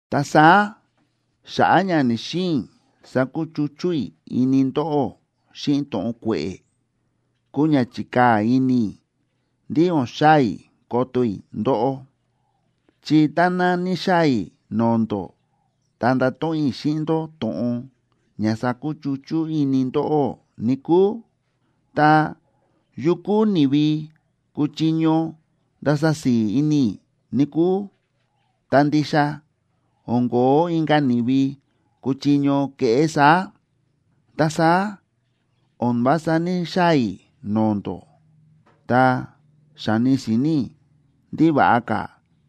Ta saá xa̱ꞌa̱ ña ní‑xiin i̱ sakuchuchú i̱ ini ndóꞌó xíꞌin to̱ꞌon kue̱ꞌe̱, kúu ña chi̱kaa̱ ini i̱ ndí o̱n xaa̱ i̱ koto i̱ ndóꞌó. Chi táná níxaa̱ i̱ no̱o̱ ndó ta ndato̱ꞌon i̱ xíꞌin ndó to̱ꞌon ña sakuchuchú ini ndóꞌó, níkúu, ta, ¿yu kúu ni̱vi kuchiño ndasa si̱i̱ ini i̱, níkúu? Ta ndixa o̱n ko̱ó inka̱ ni̱vi kuchiño keꞌé saá. Ta saá o̱n vása ní‑xaa̱ i̱ no̱o̱ ndó, ta xa̱ni si̱ni̱ i̱ ndí va̱ꞌa ka̱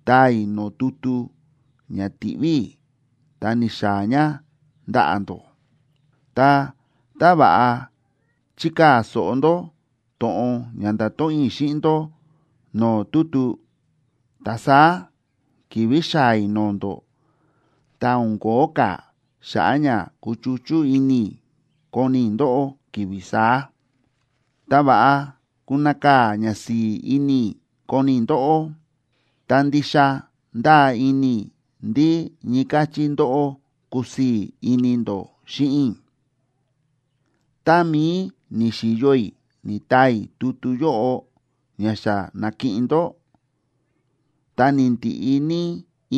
taa i̱ no̱o̱ tutu ña ti̱ꞌví i̱ ta ni̱xaa̱ ña ndaꞌa̱ ndó. Ta tá va̱ꞌa chikaa̱ so̱ꞌo ndó to̱ꞌon ña nda̱to̱ꞌon i̱ xíꞌin ndó no̱o̱ tutu, ta saá ki̱vi̱ xaa̱ i̱ no̱o̱ ndó, ta o̱n kóo ka̱ xa̱ꞌa̱ ña kuchuchú ini i̱ koni i̱ ndóꞌó ki̱vi̱ saá, ta va̱ꞌa kunakaa̱ ka̱ ñasi̱i̱ ini i̱ koni i̱ ndóꞌó. Ta ndixa ndáa ini i̱ ndí ñii káchí ndóꞌó kusii̱ ini ndó xíꞌin i̱. Tá mií ni̱xi̱yo i̱ ni̱taa i̱ tutu yóꞌo ña xa na̱kiꞌin ndó, ta ni̱ndiꞌi ní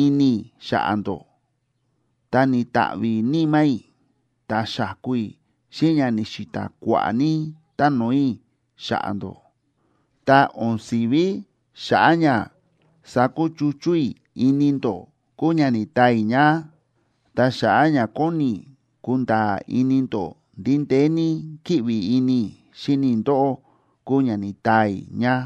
ini i̱ xa̱ꞌa̱ ndó, ta ni̱ta̱ꞌvi̱ níma̱ i̱, ta xa̱ku i̱ xíꞌin ña ni̱xi̱ta̱ kua̱ꞌa̱ ní táno̱o̱ i̱ xa̱ꞌa̱ ndó. Ta o̱n si̱ví xa̱ꞌa̱ ña sakuchuchú i̱ ini ndó kúu ña ni̱taa i̱ ña, ta xa̱ꞌa̱ ña kóni i̱ kunda̱a̱ ini ndó ndí ndeé ní kíꞌvi ini i̱ xíni i̱ ndóꞌó kúu ña ni̱taa i̱ ña.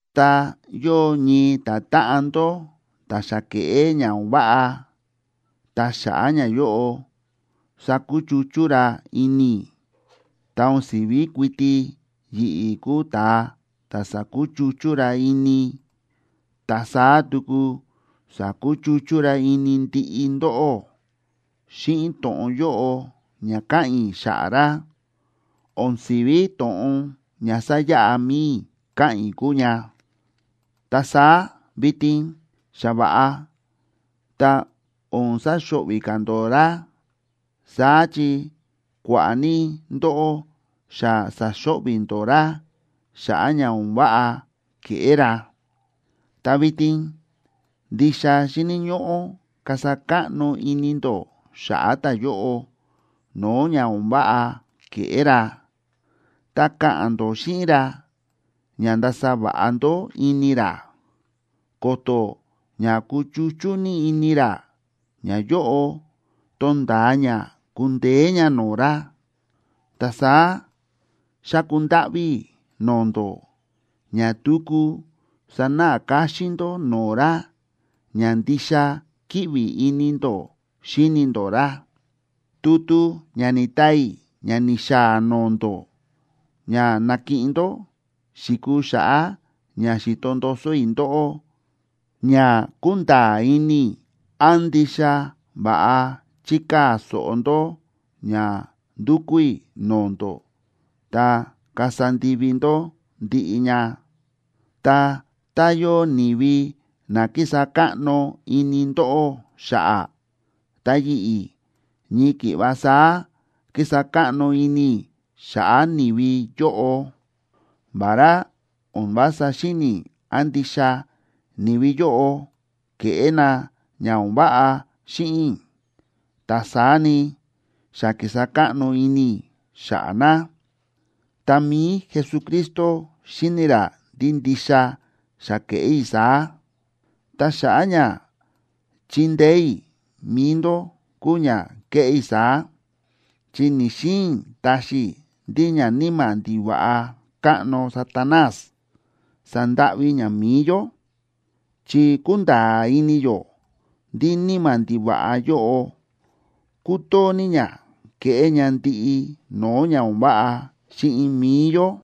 Ta yóo ñii ta̱táꞌan ndó ta̱ xa ke̱ꞌé ña o̱n váꞌa, ta xa̱ꞌa̱ ñayóꞌo sa̱kuchuchú ra ini i̱, ta o̱n si̱ví kuiti yi̱ꞌi̱ kúu ta̱a ta̱ sa̱kuchuchú ra ini, ta saá tuku sa̱kuchuchú ra ini ndiꞌi ndóꞌó. (Xíꞌin to̱ꞌon yóꞌo ña káꞌa̱n i̱ xa̱ꞌa̱ ra, o̱n si̱ví to̱ꞌon ña sáyaꞌa mi̱i i̱ káꞌa̱n i̱ kúu ña.) Ta saá vitin xa va̱ꞌa, ta o̱n saxo̱ꞌvi̱ ka̱ ndó ra. Saá chi kua̱ꞌa̱ ní ndóꞌó xa sa̱xo̱ꞌvi̱ ndó ra xa̱ꞌa̱ ña o̱n váꞌa ke̱ꞌé ra. Ta vitin ndixa xíni̱ ñóꞌó kasa káꞌno ini ndó xa̱ꞌa̱ ta̱yóꞌo no̱o̱ ña o̱n váꞌa ke̱ꞌé ra, ta ka̱ꞌa̱n ndó xíꞌin ra ña ndasa va̱ꞌa ndó ini ra, ko̱to̱ ña kuchuchú ní ini ra, ñayóꞌo tonda̱a ña kundeé ña no̱o̱ ra. Ta saá xáku ndáꞌví i̱ no̱o̱ ndó ña tuku sanáꞌa káxín ndó no̱o̱ ra ña ndixa kíꞌvi ini ndó xíni ndó ra. Tutu ña ni̱taa i̱ ña ni̱xaa̱ no̱o̱ ndó ña na̱kiꞌin ndó, xi̱kuu xa̱ꞌa̱ ña xi̱to ndoso i̱ ndóꞌó ña kunda̱a̱ ini i̱ án ndixa va̱ꞌa chikaa̱ so̱ꞌo ndó ña ndúkú i̱ no̱o̱ ndó ta kasa ndivi ndó ndiꞌi ña. Ta tá yóo ni̱vi na kísa káꞌno ini ndóꞌó xa̱ꞌa̱, ta yi̱ꞌi̱, ñii ki̱ꞌva saá kísa káꞌno ini i̱ xa̱ꞌa̱ ni̱vi yóꞌo. Vará o̱n vása xíni̱ i̱ án ndixa ni̱vi yóꞌo ke̱ꞌé na ña o̱n váꞌa xíꞌin i̱, ta saá ni, xa ki̱sa káꞌno ini i̱ xa̱ꞌa̱ na, ta mi̱i Jesucristo xíni ra ndí ndixa xa ke̱ꞌé i̱ saá. Ta xa̱ꞌa̱ ña chindeé i̱ mi̱i ndó kúu ña ke̱ꞌé i̱ saá, chi ni̱‑xiin i̱ taxi i̱ ndí ñaníma̱ ndiva̱ꞌa káꞌno Satanás sandáꞌví ña mi̱i yó. Chi kúnda̱a̱ ini yó ndí níma̱ ndiva̱ꞌa yóꞌo kútoo ní ña kéꞌé ña ndiꞌi no̱o̱ ña o̱n váꞌa xíꞌin mi̱i yó.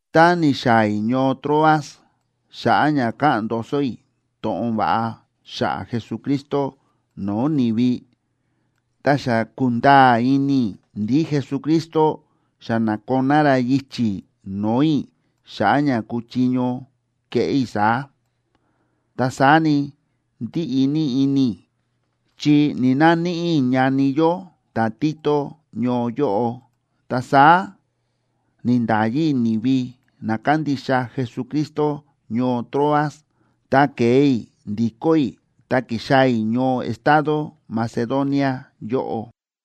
Tá ni̱xaa̱ i̱ ñoo Troas xa̱ꞌa̱ ña ka̱ꞌa̱n ndoso i̱ to̱ꞌon va̱ꞌa xa̱ꞌa̱ Jesucristo no̱o̱ ni̱vi, ta xa ku̱nda̱a̱ ini i̱ ndí Jesucristo xa na̱koná ra yichi̱ no̱o̱ i̱ xa̱ꞌa̱ ña kuchiño keꞌé i̱ saá. Ta saá ni, ndíꞌi ní ini i̱, chi ni̱‑naníꞌi i̱ ñani yó ta̱Tito ñoo yóꞌo. Ta saá ni̱nda̱yi i̱ ni̱vi na kándixa Jesucristo ñoo Troas, ta ke̱e i̱ ndikó i̱, ta kixaa̱ i̱ ñoo estado Macedonia yóꞌo.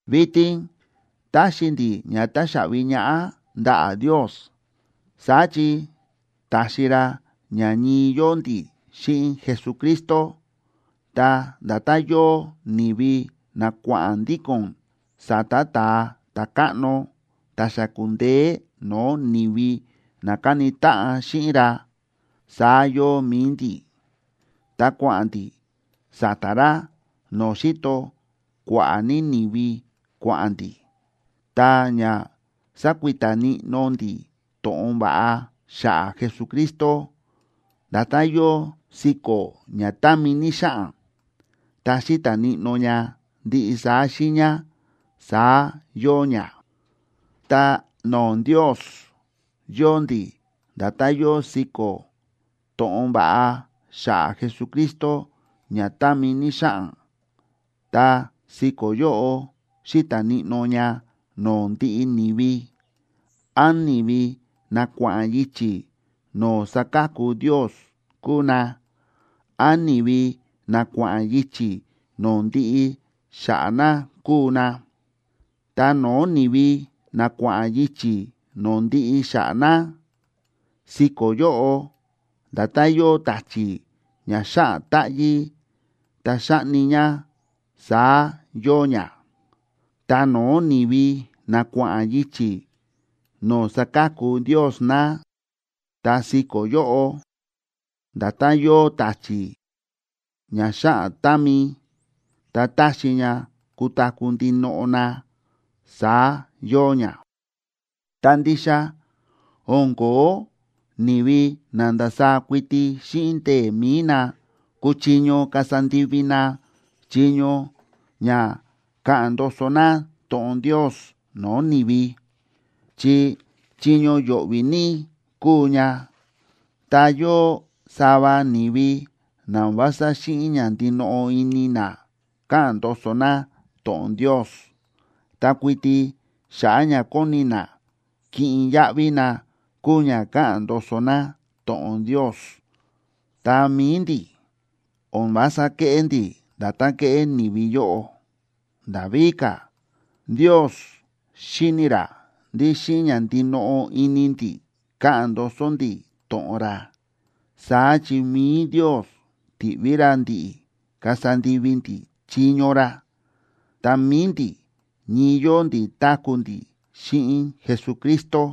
¡Vitin táxi ndi̱ ña táxaꞌvi ñaꞌá ndaꞌa̱ Ndios! Saá chi ta̱xi ra ña ñii yóo ndi̱ xíꞌin Jesucristo, ta nda̱tán yóo ni̱vi na kua̱ꞌa̱n ndíko̱n sa̱ta̱ ta̱a ta̱káꞌno ta̱ xa ku̱ndeé no̱o̱ ni̱vi na ka̱ni táꞌan xíꞌin ra, saá yóo mi̱i ndi̱, ta kua̱ꞌa̱n ndi̱ sa̱ta̱ ra no̱o̱ xíto kua̱ꞌa̱ ní ni̱vi kua̱ꞌa̱n ndi̱. Ta ña sákuita níꞌnó ndi̱ to̱ꞌon va̱ꞌa xa̱ꞌa̱ Jesucristo, nda̱tán yóo siko̱ ña támi ní xáꞌan, ta xíta̱ níꞌnó ña ndiꞌi saá xiiña, saá yóo ña. Ta no̱o̱ Ndios, yóo ndi̱ nda̱tán yóo siko̱ to̱ꞌon va̱ꞌa xa̱ꞌa̱ Jesucristo ña támi ní xáꞌan. Ta siko̱ yóꞌo xíta̱ níꞌnó ña no̱o̱ ndiꞌi ni̱vi, án ni̱vi na kua̱ꞌa̱n yichi̱ no̱o̱ sáka̱ku Ndios kúu na, án ni̱vi na kua̱ꞌa̱n yichi̱ no̱o̱ ndiꞌi xa̱ꞌa̱ na kúu na. Ta no̱o̱ ni̱vi na kua̱ꞌa̱n yichi̱ no̱o̱ ndiꞌi xa̱ꞌa̱ na, siko̱ yóꞌo nda̱tán yóo ta̱chi̱ ña xáꞌan táꞌyí ta xáꞌni ña, saá yóo ña. Ta no̱o̱ ni̱vi na kua̱ꞌa̱n yichi̱ no̱o̱ sáka̱ku Ndios na, ta siko̱ yóꞌo nda̱tán yóo ta̱chi̱ ña xáꞌan támi ta táxi ña kutaku̱ ndinoꞌo na, saá yóo ña. ¡Ta ndixa o̱n ko̱ó ni̱vi na ndasaá kuiti xíꞌin ndee̱ mi̱i na kúchiño kasa ndivi na chiño ña ka̱ꞌa̱n ndoso na to̱ꞌon Ndios no̱o̱ ni̱vi, chi chiño yo̱ꞌvi̱ ní kúu ña! Ta yóo sava ni̱vi na o̱n vása xíꞌin ña ndinoꞌo ini na káꞌa̱n ndoso na to̱ꞌon Ndios, ta kuiti xa̱ꞌa̱ ña kóni na kiꞌin yaꞌvi na kúu ña káꞌa̱n ndoso na to̱ꞌon Ndios. Ta mi̱i ndi̱, o̱n vása kéꞌé ndi̱ nda̱tán kéꞌé ni̱vi yóꞌo. Nda̱ víka̱, Ndios xíni̱ ra ndí xíꞌin ña ndinoꞌo ini ndi̱ káꞌa̱n ndoso ndi̱ to̱ꞌon ra. Saá chi mi̱i Ndios ti̱ꞌví ra ndi̱ꞌi̱ kasa ndivi ndi̱ chiño ra, ta mi̱i ndi̱ ñii yóo ndi̱ táku̱ ndi̱ xíꞌin Jesucristo.